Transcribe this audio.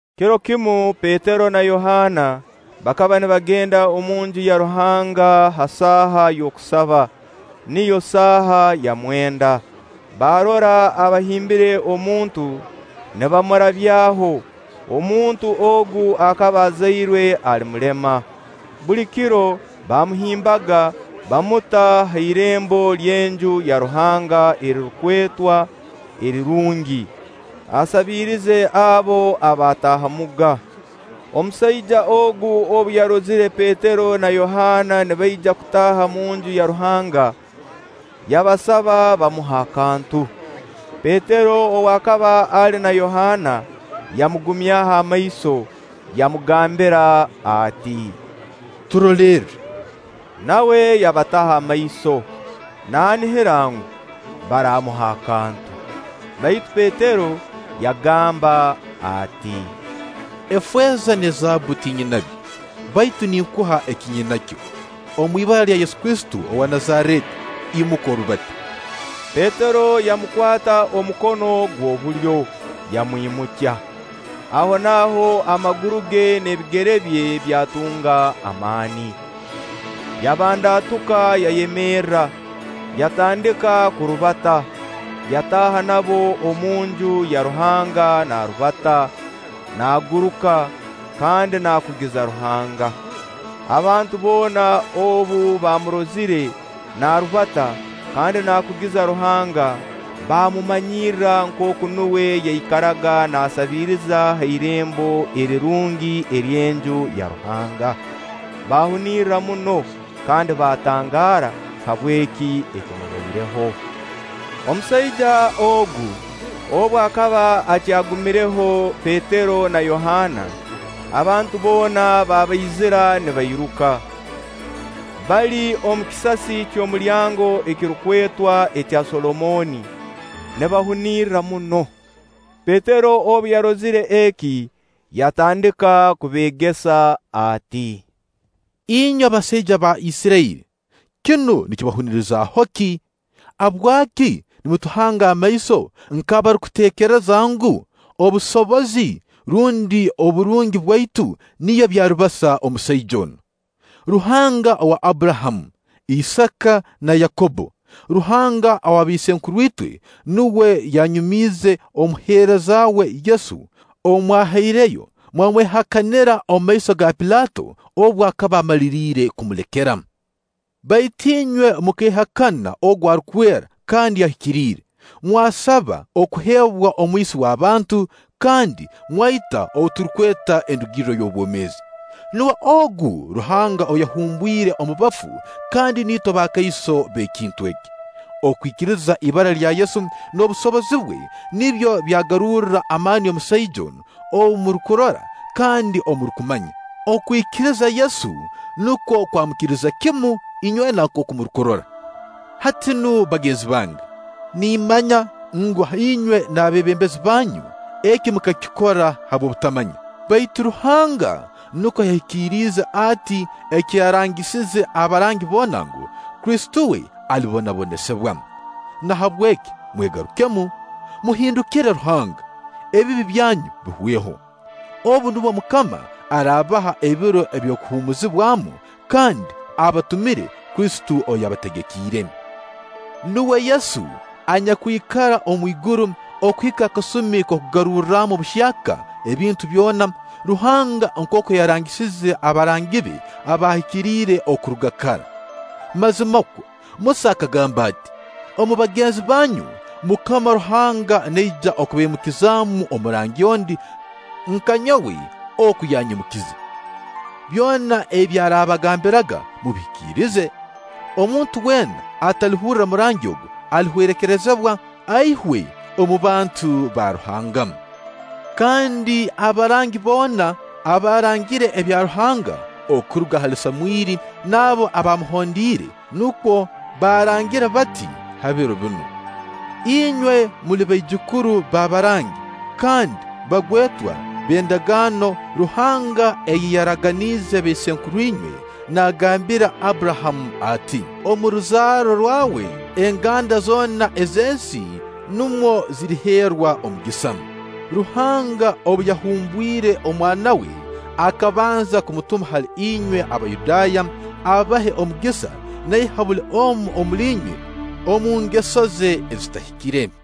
Kiro kimu Petero na Yohaana bakaba nibagenda omunju ya Ruhanga ha saaha y'okusaba, niyo saaha ya mwenda. Baarora abahimbire omuntu nibamurabyaho. Omuntu ogu akaba azairwe ali mulema. Buli kiro baamuhimbaga, baamuta ha irembo ly'Enju ya Ruhanga erirukwetwa Erirungi, asabirize abo abataahamuga. Omusaija ogu obu yarozire Petero na Yohaana nibaija kutaaha omunju ya Ruhanga, yabasaba bamuhe akantu. Petero ow'akaba ali na Yohaana yamugumyaho amaiso, yamugambira ati: “Turolerre.” Nawe yabataho amaiso, naanihira ngu, baramuha akantu. Baitu Petero yagamba ati: “Efeeza n'ezaabbu tinyinabyo, baitu ninkuha eki nyinakyo. Omu ibara lya Yesu Kristo owa Nazareeti, imuka orubate.” Petero yamukwata omukono gw'obulyo, yamwimukya. Ahonaaho amaguru ge n'ebigere bye byatunga amaani. Yabandaatuka, yayemerra, yatandika kurubata, yataaha nabo omunju ya Ruhanga naarubata, naaguruka, kandi naakugiza Ruhanga. Abantu boona obu baamurozire naarubata kandi naakugiza Ruhanga, baamumanyirra nkooku nuwe ayaikaraga naasabiiriza ha Irembo Erirungi ery'Enju ya Ruhanga, baahunirra muno kandi baatangaara habw'eki ekimubaireho. Omusaija ogu, obu akaba akyagumiireho Petero na Yohaana, abantu boona babaizira nibairuka, bali omu kisasi ky'omulyango ekirukwetwa ekya Solomooni, nibahunirra muno. Petero obu yarozire eki, yatandika kubeegesa ati: “Inywe basaija ba Isirairi, kinu nikibahunirizaho ki? Habwaki nimutuhanga amaiso nk'abarukuteekereza ngu, obusobozi rundi oburungi bwaitu nibyo byarubasa omusaija onu? Ruhanga owa Abburahamu, Isaaka na Yakobbo, Ruhanga ow'abaisenkuru itwe, nuwe yanyumiize omuheereza we Yesu, ou mwahaireyo mwamwehakanira omu maiso ga Pilaato, obu akaba amaliriire kumulekera. Baitu inywe mukeehakana ogu Arukwera kandi Ahikiriire, mwasaba okuheebwa omwisi w'abantu, kandi mwaita ou turukweta endugirro y'obwomeezi. Nuwe ogu Ruhanga ou yahumbwire omu bafu, kandi niitwe bakaiso b'ekintu eki. Okwikiriza ibara lya Yesu n'obusobozi bwe nibyo byagarurra amaani omusaija onu, ou murukurora kandi ou murukumanya. Okwikiriza Yesu nukwo kwamukiriza kimu inywena nkooku murukurora. “Hati nu bagenzi bange, nimmanya ngu, inywe n'abeebembezi banyu eki mukakikora habw'obutamanya. Baitu Ruhanga nukwo yahikiriize ati eki yarangisize abarangi boona ngu, Kristo we alibonabonesibwa. Nahabweki mwegarukemu, muhindukire Ruhanga, ebibi byanyu biihweho. Obu nubwo MUKAMA araabaha ebiro eby'okuhuumuzibwamu, kandi abatumire Kristo ou yabategekiire. Nuwe Yesu anyakwikara omwiguru okuhika akasumi k'okugarurramu buhyaka ebintu byona, Ruhanga nkooku yarangisize abarangi be abahikiriire okuruga kara. Mazimakwo Musa akagamba ati: ‘Omu bagenzi banyu, MUKAMA Ruhanga naija kubaimukizamu omurangi ondi, nka nyowe oku yanyimukize. Byona ebi araakabagambiraga, mubihikirize. Omuntu weena atalihurra murangi ogu, alihwerekerezibwa, aihwe omu bantu ba Ruhanga.’ Kandi abarangi boona abaarangire ebya Ruhanga, okuruga hali Samwiri n'abo abaamuhondiire, nukwo baarangire bati ha biro binu. Inywe muli baijukuru b'abarangi kandi bagwetwa b'endagaano Ruhanga ei yaraganiize baisenkuru inywe, naagambira Abburahamu ati: ‘Omu ruzaaro rwawe, enganda zoona ez'ensi numwo ziriheerwa omugisa.’ Ruhanga obu yahumbwire omwana we, akabanza kumutuma hali inywe Abayudaaya, abahe omugisa naiha buli omu omuli inywe omu ngeso ze ezitahikire.”